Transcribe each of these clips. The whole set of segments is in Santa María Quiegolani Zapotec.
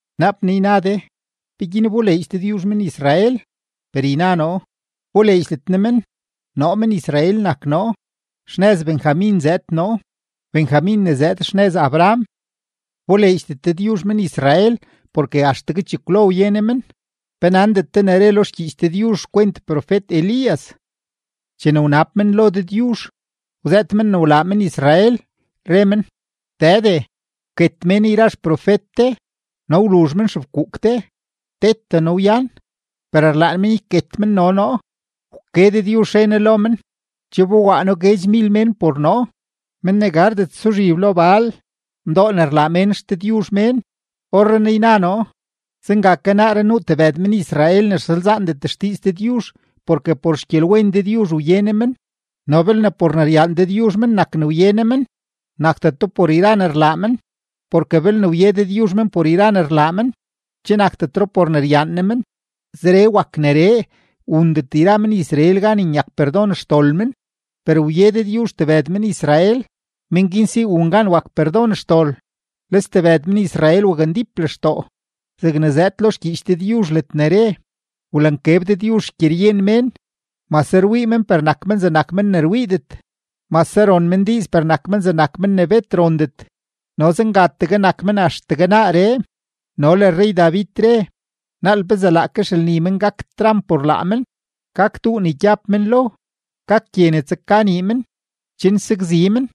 Naap naa yna de: “¿Peguin wboleedx Dëdyuzh men-Israel?” Per yna noo, wboleedxdet Ne men. Noo men-Israel nak noo, xnëz Benjamin zëëd noo, Benjamin ne zëëd xnëz Abraham. Wboleedxdet Dëdyuzh men-Israel porke axtegue chekwlo wye Ne men. ¿Pe nandet de ne re lo xgyiich Dëdyuzh xkwent profet-Elías? Chene wnab men lo Dëdyuzh, wzëët men ne wlaa men-Israel, re men: “Dëde, wket mén yra xprofet de, no wluzh men xefkuuk de; tete noo wyan, per rlaan men yket men no noo.” Wke Dëdyuzh, re Ne lo men: “Che wbowaa noo guedxmil mén por noo, men ne gardet suzhib lo Baal, mdoo ne rlaa mén xdëdyuzh mén.” Orrenaa yna noo, zenga ke naaree nuu ke tebëd men-Israel ne rsalzaandet xdiiz Dëdyuzh porke por xgyelwen Dëdyuzh wye Ne men. No belne por ne ryaan Dëdyuzh men nak ne wye Ne men, nakdeto por yra ne rlaa men. Porke belne wye Dëdyuzh men por yra ne rlaa men, che nakdetro por ne ryaan Ne men. Zeree wak neree, wundet yra men-Israel gan nyak perdon xdol men, per wye Dëdyuzh tebëd men-Israel, men guin si wun gan wak perdon xdol. Le stebëd men-Israel wakndíp lextoo. Zegne zëëd lo xgyiich Dëdyuzh ledne re: “Wlankeb Dëdyuzh xgyeryen mén; mase rwii men per nak men zegnak men ne rwiidet; mase ron men diiz per nak men zegnak men ne bet rondet, no zengategue nak men axtegue naaree.” No le rrey-David re: Naal pezee laake xelni men gak tramp por laa men, gak duu ne gyab men lo, gak gye ne tsaka nii men, chen sakzi men.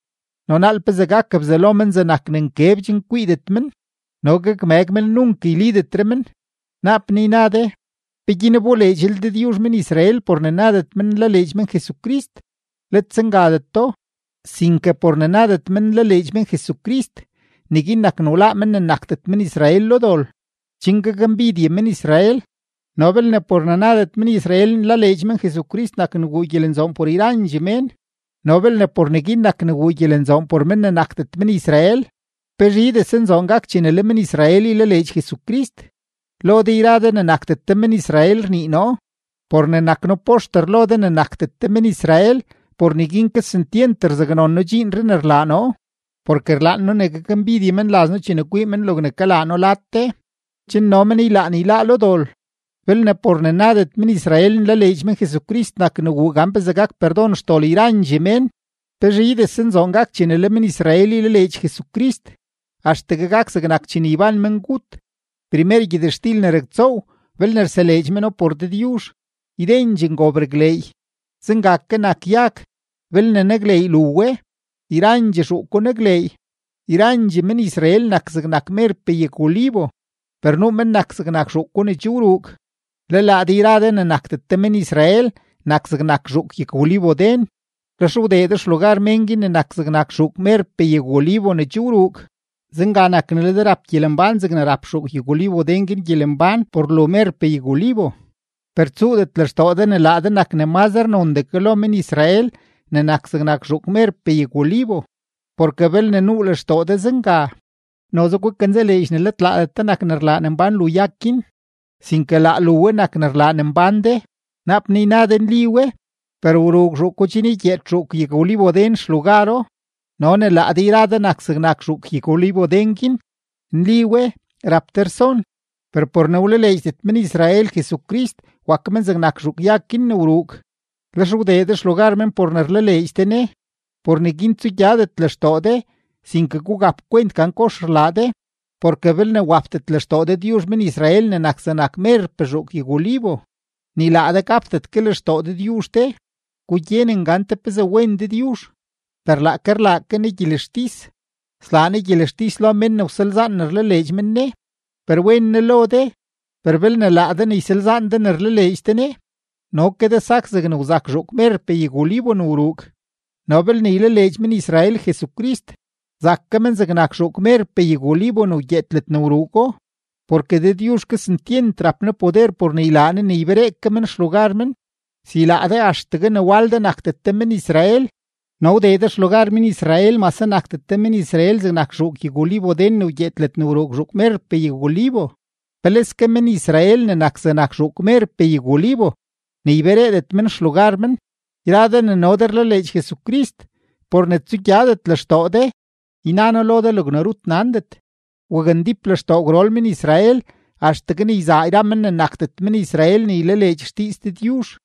No naal pezee gak bzalo men zegnak ne nkeb chen kwiidet men, no gakmëg men nunk gaknlidetre men. Naap naa yna de: “¿Peguin wboleedxlel Dëdyuzh men-Israel por ne nadet men nlaleedx men Jesucrist?” ¡Let zengadeto! Sinke por ne nadet men nlaleedx men Jesucrist, neguin nak ne wláá men ne nakdet men-Israel lo dol, chen gakmbidye men-Israel. No belne por ne nadet men-Israel nlaleedx men Jesucrist nak ne wuu gyelenzoon por yrandxee mén, no belne por neguin nak ne wuu gyelenzoon por men ne nakdet men-Israel, ¡pezhidese nzoon gak chene le men-Israel ylaleedx Jesucrist! Lo de yra de ne nakdet de men-Israel rnii noo. Por ne nak noo poxter lo de ne nakdet de men-Israel, por neguin kesentyent rzaknon noo dxiinree ne rlaa noo, porke rlaan noo ne gakmbidye menlaz noo chene kwii men logne kalaa noo lad de, chen no men ylaan yláá lo dol. Belne por ne nadet men-Israel nlaleedx men Jesucrist nak ne wuu gan pezee gak perdon xdol yrandxee mén, ¡pezhidese nzoon gak chene le men-Israel ylaleedx Jesucrist! Axtegue gak zegnak chene yban mengut. Primer gyëtxtil ne raktsoow, belne rseleedx meno por Dëdyuzh, ydendxee ngob rakleey. Zenga ke nak yag; belne nakleey lu we, yrandxee zhuuko nakleey. Yrandxee men-Israel nak zegnak merpee yag-olivo, per nuu men nak zegnak zhuuko ne che wruug. Le laa de yra de ne nakdet de men-Israel nak zegnak zhuuk yag-olivoden. Lex wdee de xlugar men guin ne nak zegnak zhuuk merpee yag-olivo ne che wruug. Zenga nak ne le de rap gyelembán zegne rap zhuuk yag-olivoden guin gyelembán por lu merpee yag-olivo. Per tsuudet lextoo de ne laa de nak ne mazre nondee ke lo men-Israel ne nak zegnak zhuukpee yag-olivo. Porke belne nuu lextoo de zenga, noze gukanzaleedx ne let laadet de nak ne rlaa ne mbán lu yag guin, sinke laa lu we nak ne rlaa ne mbán de. Naap naa yna de nli we, per wruug zhuuko chen ygyeed zhuuk yag-olivoden xlugaro no ne laa de yra de nak zegnak zhuuk yag-olivoden guin. Nli we, rap de rson, per por ne wlaleedxdet men-Israel Jesucrist, wak men zegnak zhuuk yag guin ne wruug, lex wdee de xlugar men por ne rlaleedx de Ne. Por neguin tsugyadet lextoo de, sinke gugap kwent gan kox rlaa de. Porke belne wapdet lextoo Dëdyuzh men-Israel ne nak zegnak zhuukpee yag-olivo, ni laa de gapdet ke lextoo Dëdyuzh de. Gugyenen gante pezee wen Dëdyuzh, per laake rlaa ke Ne gyelextis. Slaa Ne gyelextis lo men ne wsalzaan ne rlaleedx men Ne, per wen Ne lo de. Per belne laa de ne ysalzaan de ne rlaleedx de Ne, no ke de sak zeg wzak zhuuk merpee yag-olivo ne wruug. No belne ylaleedx men-Israel Jesucrist, zak ke men zegnak zhuuk merpee yag-olivo ne wgyeed ke ledne wruugo, porke Dëdyuzh kesentyent rap Ne poder por ne ylaa Ne ne yberee ke men xlugar men. Si laa de axtegue ne wal de nakdet de men-Israel no wdee de xlugar men-Israel mase nakdet de men-Israel zegnak zhuuk yag-olivoden ne wgyeed ledne wruug zhuuk merpee yag-olivo, ¡peleske men-Israel ne nak zegnak zhuuk merpee yag-olivo ne ybereedet men xlugar men! Yra de ne no de rlaleedx Jesucrist, por ne tsugyadet lextoo de, yna noo lo de logne rut nandet: wakndíp lextoo gwrol men-Israel axtegue ne yzaa yra men ne nakdet men-Israel ne ylaleedx xdiiz Dëdyuzh,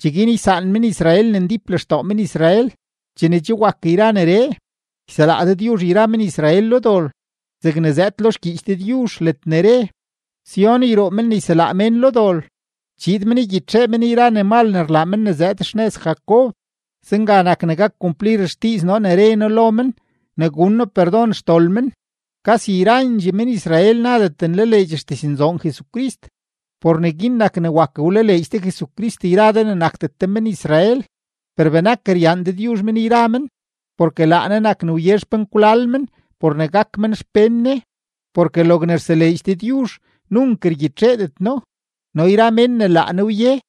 cheguin ysaan men-Israel ne ndíp lextoo men-Israel. Chene che wak yra neree, yselaa Dëdyuzh yra men-Israel lo dol zegne zëëd lo xgyiich Dëdyuzh ledne re: Sión yruu men ne yselaa mén lo dol, chiid men ygyitxee men yra ne mal ne rlaa men ne zëëd xnëz Jacob. Zenga nak ne gak kumplir xdiiz noo ne re noo lo men ne gun noo perdon xdol men. Kasi yrandxee men-Israel nadet nlaleedx xdiznzoon Jesucrist, por neguin nak ne wak wlaleedx de Jesucrist yra de ne nakdet de men-Israel. Per benak ryaan Dëdyuzh men yra men, porke laa Ne nak ne wye xpenkwlal men por ne gak men xpén Ne. Porke logne rseleedx Dëdyuzh nunk rgyitxeedet No, no yra mén ne laa Ne wye,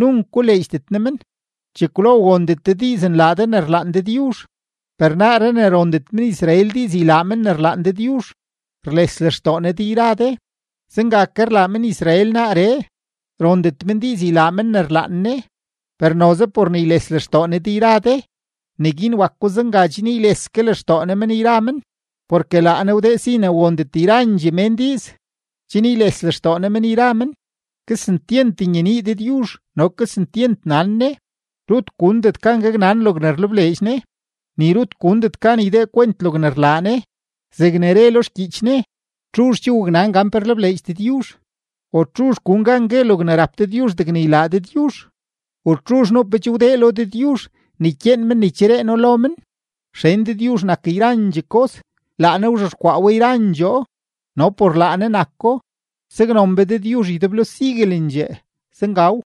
nunk koleedxdet Ne men. Chekwlo wondet de diiz nlaa de ne rlaan Dëdyuzh, per naaree ne rondet men-Israel diiz ylaa men ne rlaan Dëdyuzh, rles lextoo Ne de yra de; zenga ke rlaa men-Israel naaree, rondet men diiz ylaa men ne rlaan Ne, per noze por ne yles lextoo Ne de yra de, neguin wako zenga chen yles ke lextoo Ne men yra men. Porke laa Ne wdee si ne wondet yrandxee mén diiz, chen yles lextoo Ne men yra men. ¡Kesentyent nyenii Dëdyuzh no kesentyent nan Ne! Rut gundet gan gaknan logne rlebleedx Ne, ni rut gundet gan ydee kwent logne rlaa Ne. Zegne re lo xgyiich Ne: “¿Txuzh che waknan gan pe rlebleedx Dëdyuzh? ¿U txuzh gun gan gue logne rap Dëdyuzh degne ylaa Dëdyuzh? ¿U txuzh nuu pe che wdee lo Dëdyuzh ne ykyeen men ne ycheree No lo men?” Xen Dëdyuzh nak yrandxee kos, laa Ne wzhexkwaa we yrandxoo, no por laa Ne nako. ¡Saknon be Dëdyuzh ydeblo siguelendxee! Zengaw.